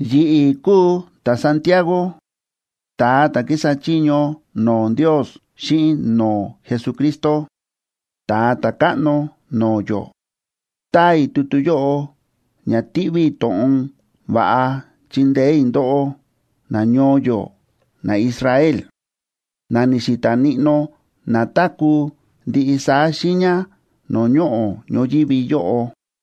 Yi̱ꞌi̱ kúu ta̱Santiago, ta̱a ta̱ kísa chiño no̱o̱ Ndios xíꞌin no̱o̱ Jesucristo, Ta̱a Ta̱káꞌno no̱o̱ yó. Táa i̱ tutu yóꞌo ña tiꞌví i̱ to̱ꞌon va̱ꞌa chindeé i̱ ndóꞌó nañoo yó naIsrael, na ni̱xi̱ta̱ níꞌnó na táku̱ ndiꞌi saá xiiña no̱o̱ ñoꞌo̱ ñoyívi yóꞌo.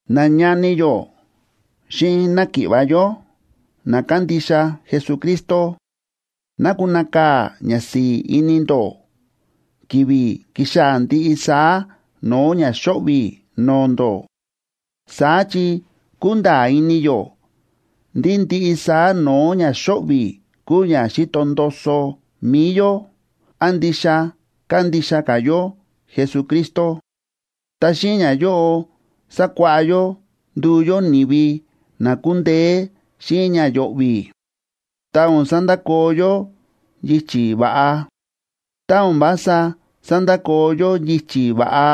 Nañani yó xíꞌin náki̱ꞌva̱ yó na kándixa Jesucristo, ná kunakaa̱ ñasi̱i̱ ini ndó ki̱vi̱ kíxaa̱ ndiꞌi saá no̱o̱ ña xóꞌvi̱ no̱o̱ ndó. Saá chi kúnda̱a̱ ini yó ndí ndiꞌi saá no̱o̱ ña xóꞌvi̱ kúu ña xíto ndoso mi̱i yó án ndixa kándixa ka̱ yó Jesucristo. Ta xíꞌin ñayóꞌo sákuáꞌá yó nduu yó ni̱vi na kundeé xíꞌin ña yo̱ꞌvi̱, ta o̱n sandakoo yó yichi̱ va̱ꞌa. Tá o̱n vása sandakoo yó yichi̱ va̱ꞌa,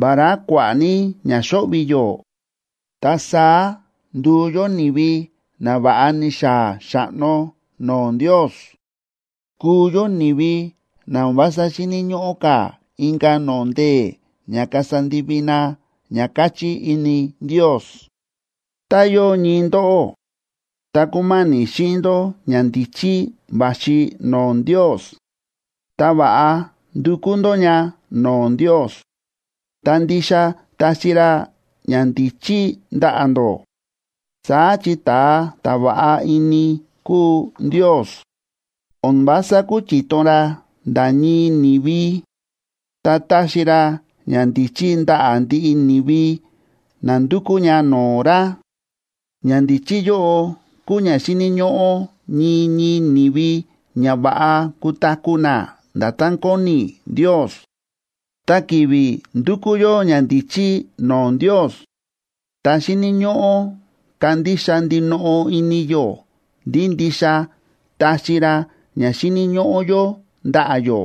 vará kua̱ꞌa̱ ní ña xóꞌvi̱ yó, ta saá nduu yó ni̱vi na va̱ꞌa ni̱xaa̱ xa̱ꞌno no̱o̱ Ndios, kuu yó ni̱vi na o̱n vása xíni̱ ñóꞌó ka̱ inka̱ no̱o̱ ndee̱ ña kasa ndivi na ña káchí ini Ndios. Ta yóo ñii ndóꞌó, ta kúma̱ni̱ xíꞌin ndó ñandíchí va̱xi no̱o̱ Ndios, ta va̱ꞌa ndukú ndó ña no̱o̱ Ndios, ta ndixa taxi ra ñandíchí ndaꞌa̱ ndó. Saá chi ta̱a ta̱ va̱ꞌa ini kúu Ndios, o̱n vása kúchiton ra nda̱ ñii ni̱vi, ta táxi ra ñandíchí ndaꞌa̱ ndiꞌi ni̱vi na ndúkú ña no̱o̱ ra; ñandíchí yóꞌo kúu ña xíni̱ ñóꞌó ñii ñii ni̱vi ña va̱ꞌa kutaku̱ na nda̱tán kóni Ndios. Ta ki̱vi̱ ndúkú yó ñandíchí no̱o̱ Ndios, ta xíni̱ ñóꞌó kandixa ndinoꞌo ini yó ndí ndixa taxi ra ña xíni̱ ñóꞌó yó ndaꞌa̱ yó.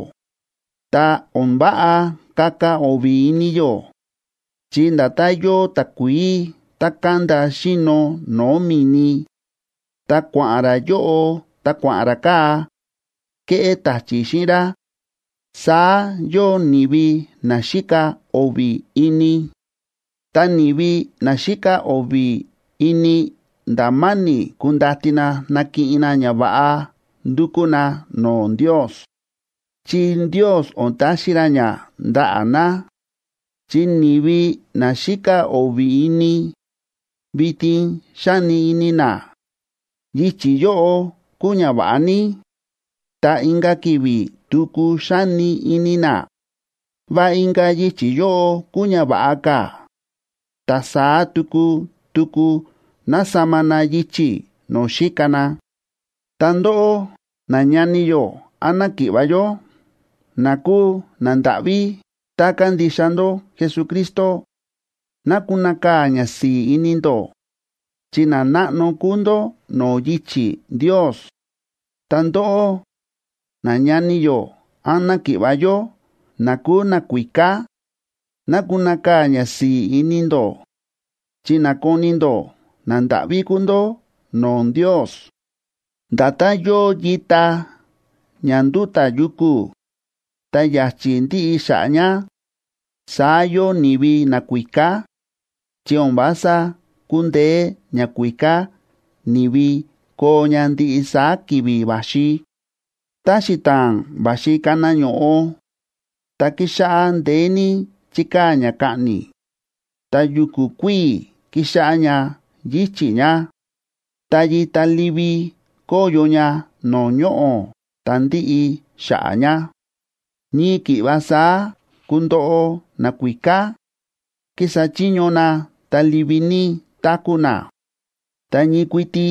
Ta o̱n váꞌa kaka o̱vi̱ ini yó, chi nda̱tán yóo takuií tá kánda xíno no̱o̱ mi̱ni, ta kua̱ꞌa̱n rá yóꞌo ta kua̱ꞌa̱n rá kaa̱, ke̱ꞌé ta̱chi̱ xíꞌin rá, saá yóo ni̱vi na xíka o̱vi̱ ini. Ta ni̱vi na xíka o̱vi̱ ini nda̱ ma̱ni̱ kundati na nakiꞌin na ñava̱ꞌa ndukú na no̱o̱ Ndios, chi Ndios o̱n taxi ra ña ndaꞌa̱ na. Chi ni̱vi na xíka o̱vi̱ ini, vitin xáni ini na: “Yichi̱ yóꞌo kúu ña va̱ꞌa ní”, ta inka̱ ki̱vi̱ tuku xáni ini na: “Va inka̱ yichi̱ yóꞌo kúu ña va̱ꞌa ka̱”, ta saá tuku tuku násama na yichi̱ no̱o̱ xíka na. Ta ndóꞌó, nañani yó án náki̱ꞌva̱ yó na kúu nandáꞌví ta kándixa ndó Jesucristo, ná kunakaa̱ ñasi̱i̱ ini ndó, chi nanáꞌno kúu ndó no̱o̱ yichi̱ Ndios. Ta ndóꞌó, nañani yó án náki̱ꞌva̱ yó na kúu nakuíká, ná kunakaa̱ ñasi̱i̱ ini ndó chi nákoni ndó nandáꞌví kúu ndó no̱o̱ Ndios. Nda̱tán yóo yita ña ndúta̱ yuku̱, ta ya̱chi̱ ndíꞌi xa̱ꞌa̱ ña, saá yóo ni̱vi nakuíká, chi o̱n vása kundeé ñakuíká ni̱vi koo ña ndiꞌi saá ki̱vi̱ va̱xi. Tá xita̱a̱n va̱xi kana ño̱ꞌo, ta kíxáꞌá ndeé ní chíkaa̱ ña kaꞌni̱, ta yu̱ku̱ kuíi̱ kíxáꞌá ña yíchi̱ ña, ta yita livi kóyo ña no̱o̱ ñoꞌo̱, ta ndíꞌi xa̱ꞌa̱ ña. Ñii ki̱ꞌva saá kundoꞌo nakuíká, kísa chiño na ta livi ní táku̱ na, ta ñii kuiti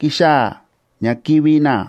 kixaa̱ ña kivi̱ na.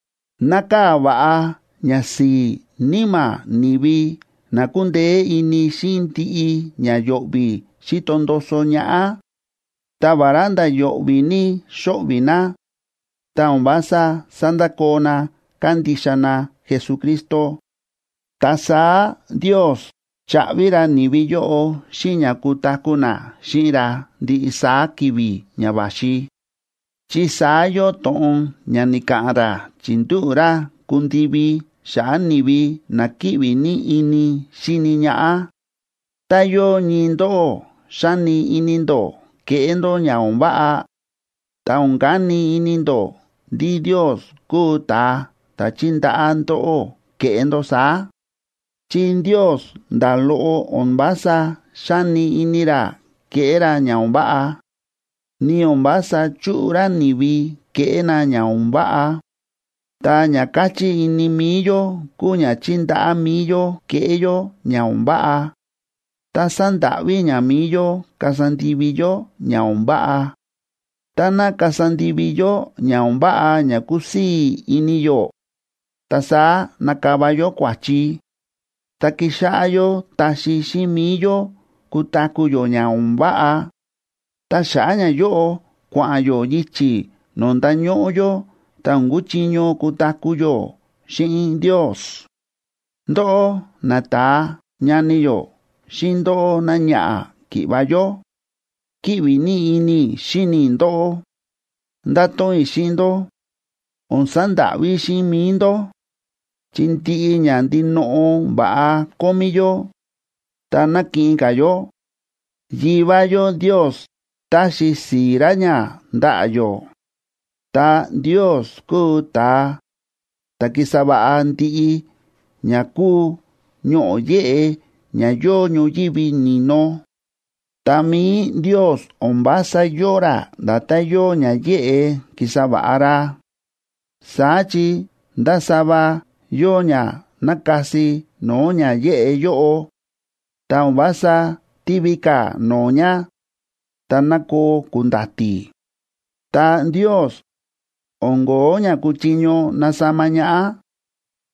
Nákaa̱ va̱ꞌa ñasi̱i̱ níma̱ ni̱vi na kúndeé ini xíꞌin ndiꞌi ña yo̱ꞌvi̱ xíto ndoso ñaꞌá, ta vará nda̱ yo̱ꞌvi̱ ní xóꞌvi̱ na, ta o̱n vása sándakoo na kándixa na Jesucristo. Ta saá Ndios chaꞌvi ra ni̱vi yóꞌo xíꞌin ña kutaku̱ na xíꞌin ra ndiꞌi saá ki̱vi̱ ña va̱xi, chi saá yóo to̱ꞌon ña ni̱ka̱ꞌa̱n ra chi̱ndúꞌu̱ ra kundivi xa̱ꞌa̱ ni̱vi na kíꞌvi ní ini xíni ñaꞌá. Tá yóo ñii ndóꞌó xáni ini ndó keꞌé ndó ña o̱n váꞌa, ta o̱n kani ini ndó ndí Ndios kúu ta̱a ta̱ chíndaꞌá ndóꞌó keꞌé ndó saá. Chi Ndios nda̱ loꞌo o̱n vása xáni ini ra keꞌé ra ña o̱n váꞌa, ni o̱n vása chúꞌu ra ni̱vi keꞌé na ña o̱n váꞌa. Ta ña káchí ini mi̱i yó kúu ña chíndaꞌá mi̱i yó keꞌé yó ña o̱n váꞌa, ta sándáꞌví ña mi̱i yó kasa ndivi yó ña o̱n váꞌa. Táná kasa ndivi yó ña o̱n váꞌa ña kúsii̱ ini yó, ta saá nakava yó kua̱chi, ta kixáꞌá yó taxi xíꞌin mi̱i yó kutaku̱ yó ña o̱n váꞌa. Ta xa̱ꞌa̱ ñayóꞌo kua̱ꞌa̱n yó yichi̱ no̱o̱ ndañóꞌó yó ta o̱n kuchiño kutaku̱ yó xíꞌin Ndios. Ndóꞌó nata̱a ñani yó xíꞌin ndóꞌó náñaꞌa̱ ki̱ꞌva̱ yó, kíꞌvi ní ini i̱ xíni i̱ ndóꞌó. Ndáto̱ꞌon i̱ xíꞌin ndó: O̱n sandáꞌví xíꞌin mi̱i ndó. Chi ndiꞌi ña ndinoꞌo va̱ꞌa kómí yó ta nakiꞌin ka̱ yó, Yivá yó Ndios táxi si̱i̱ ra ña ndaꞌa̱ yó. Ta Ndios kúu ta̱a ta̱ ki̱sa va̱ꞌa ndiꞌi ña kúu ñoꞌo̱ yéꞌe ña yóo ñoyívi ni̱no. Ta mi̱i Ndios o̱n vása yóo ra nda̱tán yóo ña yéꞌe ki̱sa va̱ꞌa ra, saá chi ndásava yóo ña nákasi no̱o̱ ña yéꞌe yóꞌo, ta o̱n vása tívi ka̱ no̱o̱ ña ta nákoo ku̱nda̱ti̱. Ta Ndios, o̱n ko̱ó ña kúchiño nasama ñaꞌá,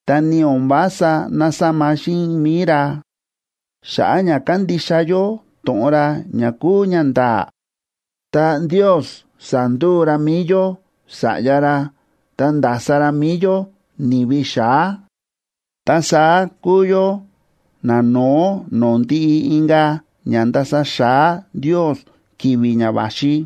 ta ni o̱n vása násama xíꞌin mi̱i ra. Xa̱ꞌa̱ ña kándixa yó to̱ꞌon ra ña kúu ñanda̱a̱, ta Ndios sa̱nduu ra mi̱i yó sa̱ꞌya ra, ta nda̱sa ra mi̱i yó ni̱vi xa̱á. Ta saá kúu yó nano̱ó no̱o̱ ndiꞌi inka̱ ña ndasa xa̱á Ndios ki̱vi̱ ña va̱xi.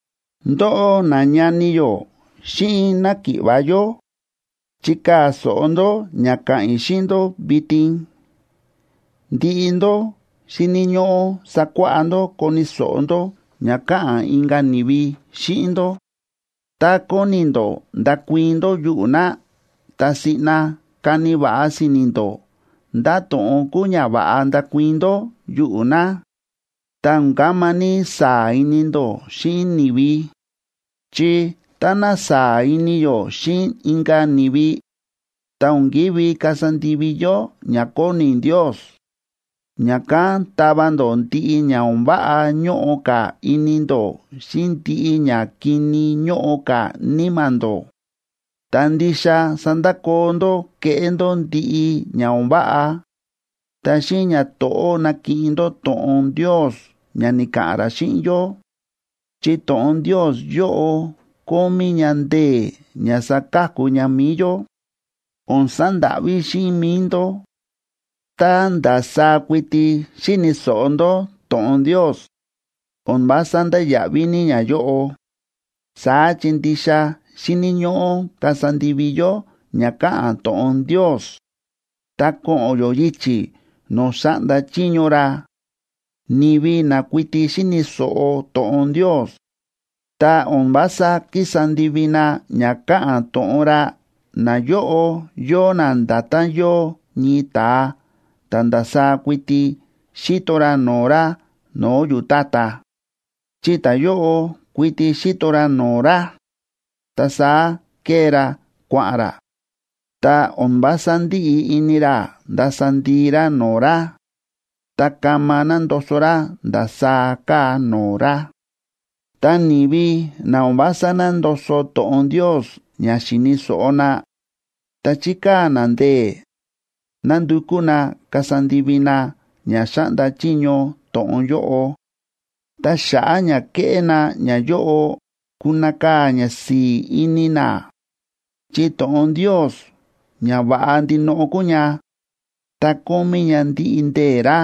Ndóꞌó nañani yó xíꞌin náki̱ꞌva̱ yó, chikaa̱ so̱ꞌo ndó ña ka̱ꞌa̱n i̱ xíꞌin ndó vitin: Ndiꞌi ndó xíni̱ ñóꞌó sakuáꞌá ndó koni̱ so̱ꞌo ndó ña káꞌa̱n inka̱ ni̱vi xíꞌin ndó; tá kóni ndó ndakuii̱n ndó yuꞌu̱ na, ta siꞌna kani va̱ꞌa si̱ni̱ ndó ndá to̱ꞌon kúu ña va̱ꞌa ndakuii̱n ndó yuꞌu̱ na. Ta o̱n kama ní saa̱ ini ndó xíꞌin ni̱vi. Chi táná saa̱ ini yó xíꞌin inka̱ ni̱vi, ta o̱n kívi kasa ndivi yó ña kóni Ndios. Ña̱kán tava ndó ndiꞌi ña o̱n váꞌa ñóꞌo ka̱ ini ndó xíꞌin ndiꞌi ñakini ñóꞌo ka̱ níma̱ ndó, ta ndixa sandakoo ndó kéꞌé ndó ndiꞌi ña o̱n váꞌa. Ta xíꞌin ñato̱ꞌó nakiꞌin ndó to̱ꞌon Ndios ña ni̱ka̱ꞌa̱n ra xíꞌin yó. Chi to̱ꞌon Ndios yóꞌo kómí ña ndee̱ ña saka̱ku ña mi̱i yó. O̱n sandáꞌví xíꞌin mi̱i ndó. Tá ndasaá kuiti xíni̱ so̱ꞌo ndó to̱ꞌon Ndios, o̱n vása ndáya̱ꞌví ní ñayóꞌo. Saá chi ndixa xíni̱ ñóꞌó kasa ndivi yó ña káꞌa̱n to̱ꞌon Ndios, ta ko̱ꞌo̱n yó yichi̱ no̱o̱ xáꞌnda chiño ra. Ni̱vi na kuiti xíni̱ so̱ꞌo to̱ꞌon Ndios, ta o̱n vása kísa ndivi na ña káꞌa̱n to̱ꞌon ra, nayóꞌo yóo na nda̱tán yóo ñii ta̱a ta̱ ndasaá kuiti xíto ra no̱o̱ ra no̱o̱ yu̱tátá. Chi ta̱yóꞌo kuiti xíto ra no̱o̱ ra, ta saá kée ra kua̱ꞌa̱n ra, ta o̱n vása ndíꞌi ini ra ndasa ndii ra no̱o̱ ra, ta kama nándoso ra ndasaá káa no̱o̱ ra. Ta ni̱vi na o̱n vása nándoso to̱ꞌon Ndios ña xi̱ni̱ so̱ꞌo na, ta chíkaa̱ na ndee̱ nándukú na kasa ndivi na ña xáꞌnda chiño to̱ꞌon yóꞌo, ta xa̱ꞌa̱ ña kéꞌé na ñayóꞌo, kunakaa̱ ñasi̱i̱ ini na. Chi to̱ꞌon Ndios ña va̱ꞌa ndinoꞌo kúu ña, ta kómí ña ndiꞌi ndee̱ ra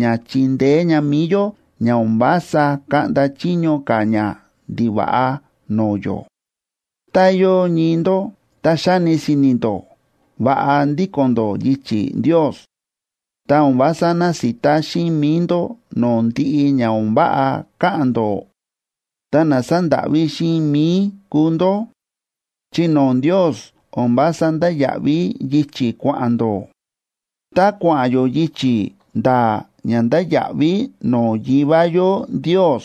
ña chindeé ña mi̱i yó ña o̱n vása kaꞌnda chiño ka̱ ñandiva̱ꞌa no̱o̱ yó. Tá yóo ñii ndó ta xáni si̱ni̱ ndó va̱ꞌa ndíko̱n ndó yichi̱ Ndios, ta o̱n vása násita xíꞌin mi̱i ndó no̱o̱ ndiꞌi ña o̱n váꞌa káꞌa̱n ndó, ta na sándáꞌví xíꞌin mi̱i kúu ndó, chi no̱o̱ Ndios o̱n vása ndáya̱ꞌví yichi̱ kua̱ꞌa̱n ndó. Tá kua̱ꞌa̱n yó yichi̱ nda̱a̱ ña ndáya̱ꞌví no̱o̱ Yivá yó Ndios,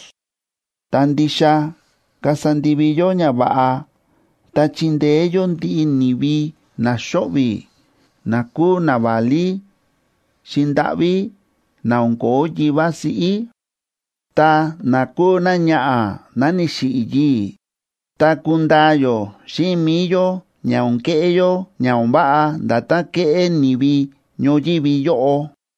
ta ndixa kasa ndivi yó ñava̱ꞌa ta chindeé yó ndiꞌi ni̱vi na xóꞌvi̱, na kúu naválí xi̱ndáꞌví na o̱n ko̱ó yivá siꞌí, ta na kúu náñaꞌa̱ ná ni̱xiꞌi̱ yii̱, ta kundaa yó xíꞌin mi̱i yó ña o̱n keꞌé yó ña o̱n váꞌa nda̱tán kéꞌé ni̱vi ñoyívi yóꞌo.